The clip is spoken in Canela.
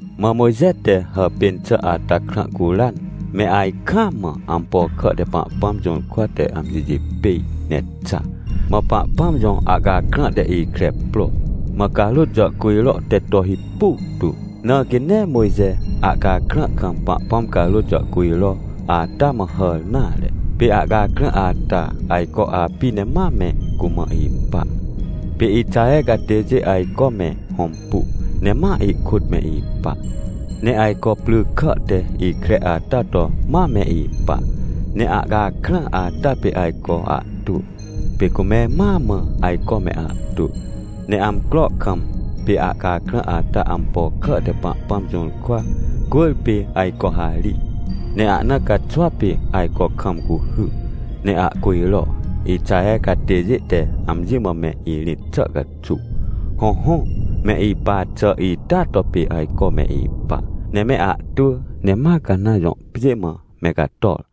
Mã Mojxe te hàpên xà ata krã curan, me ajkaam mã ampo kà te Pahpãm jũrkwa te amjijipêj ne xa. Mã Pahpãm jõ ahcakrã te ikre pro, mã carôt jàhcujro teto hipu tu. Na quê nee Mojxe ahcakrã kam Pahpãm carôt jàhcujro ata mã hàr nare. Pê ahcakrã ata ajco api ne mame cumã ipa. Pê Ixaher catêjê ajcome hõmpu ne ma ihkôt me ipa. Ne ajco pry kà te ikre ata to ma me ipa. Neahcakrã ata pê ajco ahtwỳ, pê cume mãa mã ajcome ahtwỳ. Ne amcro kam pê ahcakrãata ampo kà te Pahpãm jũrkwa cwỳrpê ajco harij, ne ahna caxwa pê ajco kam cuhy, ne ahcujro, Ixaher catêjê te amji mã me irĩt xà caxuw. Hõhõ, me ipa xà ita to pê ajco me ipa, ne meahtwỳ. Ne ma Canãn jõ pjê mã me cator.